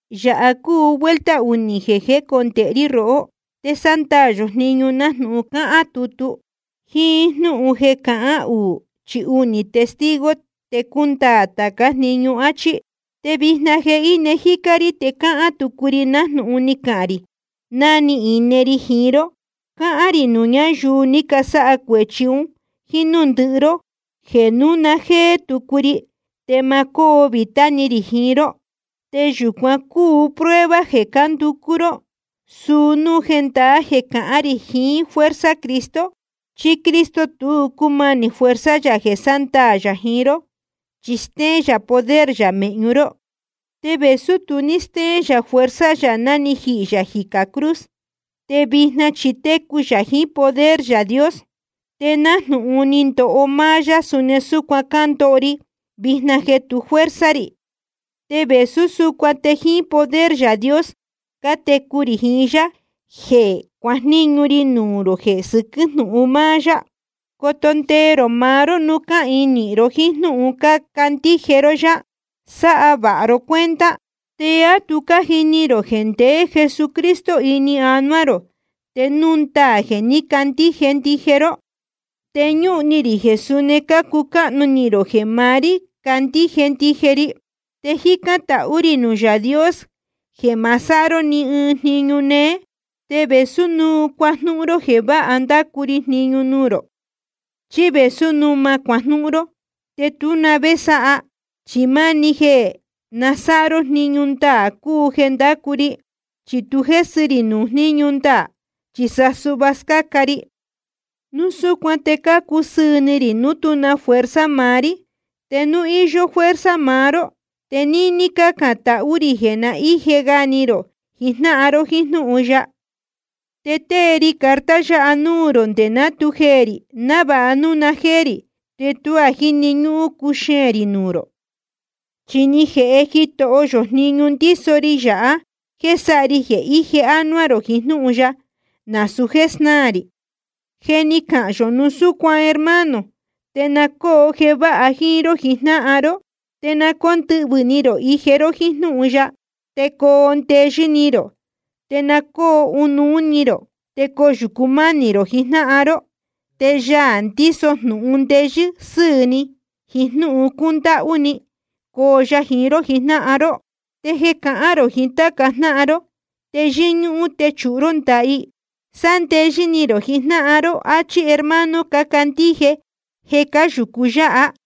Yāha cúu vuelta unī jeē jécondēhe rí rohó. Te sándaā yō jniñu nájnūhun cáhán tutu: Jíín jnúhun jeē cahán uū chí únī testigo te cundaā tācá jniñu, áchí. Te vijna jeē íne jícá rí te cáhán tucu ri nájnūhun ni cahān rī ná ni ine ri jiín ró. Cáhán rī nuū ñáyuu ni casáha cuēchi un jíín núū ndɨhɨ ró, jeē núu na jéé tucu ri te ma cóo vītá ni rī jiín ró. Te yūcuán cuu prueba jeē cánducú ró, suu núu jendaá jeē cahán rī jiín fuerza Cristo. Chi Cristo tu cúmanī fuerza yā jeē sándaā yā jiín ró, chi stéén yā poder yā mēhñu ró. Te vēsú tu ní stéén yā fuerza yā ná ni jihī yā jicā cruz, te vijna chi técu yā jiín poder Yaā Dios. Te nájnūhun ni ndoho máá yá, suni súcuan cándoho ri vijna jeē tu fuerza rī. Te vēsú súcuan te jíín poder Yaā Dios cátecu rī jiín yá jeē cuajníñu ri nuū rō jeē sɨquɨ́ jnúhun ya. Coto ndee rō maá ró núu cáhīin nīhin ró jíín jnúhun cácandíje ró yá. Sáha vāha ro cuenta. ¿Te á tu cájini rō jeē ndeé Jesucristo ini anuá rō, te núu ndaā jeē ní cacandíje ndije ró? Te ñúhun ni rī jeē suni cácucáhnu ni rō jeē maá rí cácandíje ndije ri. Te cájicān tahú rī nuū Yaā Dios jeē ma sáha ró ni ɨɨn jniñu néé. Te vēsú núu cuajnúhún ró jeē váha ndácu ri jniñu nuū rō, chí vēsú núu ma cuajnúhún ró, te tú na vé sáha, chi máni jeē na sáha ró jniñu ndaā cúu jeē cánducú rí. Chi tu jésɨ ri nuū jníñu ndaā, chi sa suhva scáca ri. Núu súcuan te cácusɨɨ̄ ni rī núu tú na fuerza maá rí, te núu íyó fuerza maá ró. Te níní cácān tahú rī jeē na íje ga ni rō jijnáhan ró jíín jnúhun ya. Te tée ri carta yáha nuū rō nde ná tu jeē rī, návāha núu na jéé rī te tuá jíni ñúhún cuxeēn rī nuū rō. Chi ni jēhe Jitoho yō jniñu ndíso ri yāha jéē sáha ri jeē íje ánuá rō jiín jnúhun ya, nasūu jéē snáā rī. Je ni cahān yō núu súcuan hermano, te na cóo jeē váha jíín ró jijnáhan ró. Te na cóndɨhvɨ̄ ni rō ije ró jíín jnúhun ya, te coo ndeyɨ́ ni rō. Te na cóo ɨnuú ni rō te coyūcu mánī rō jiín jnáhan ró. Te Yaā ndíso jnūhun ndeyɨ́ sɨ́ɨ̄ ni jiín jnúhun cúndáhú ni, coo ya jiín ró jijnáhan ró. Te jeē cahán rō jiín táca jnáhan ró, te yɨ́ñúhún techūhu ró ndaha i. Sándeyɨ́ ni rō jijnáhan ró, áchí hermano cácandíje jeē cáyūcu yáha.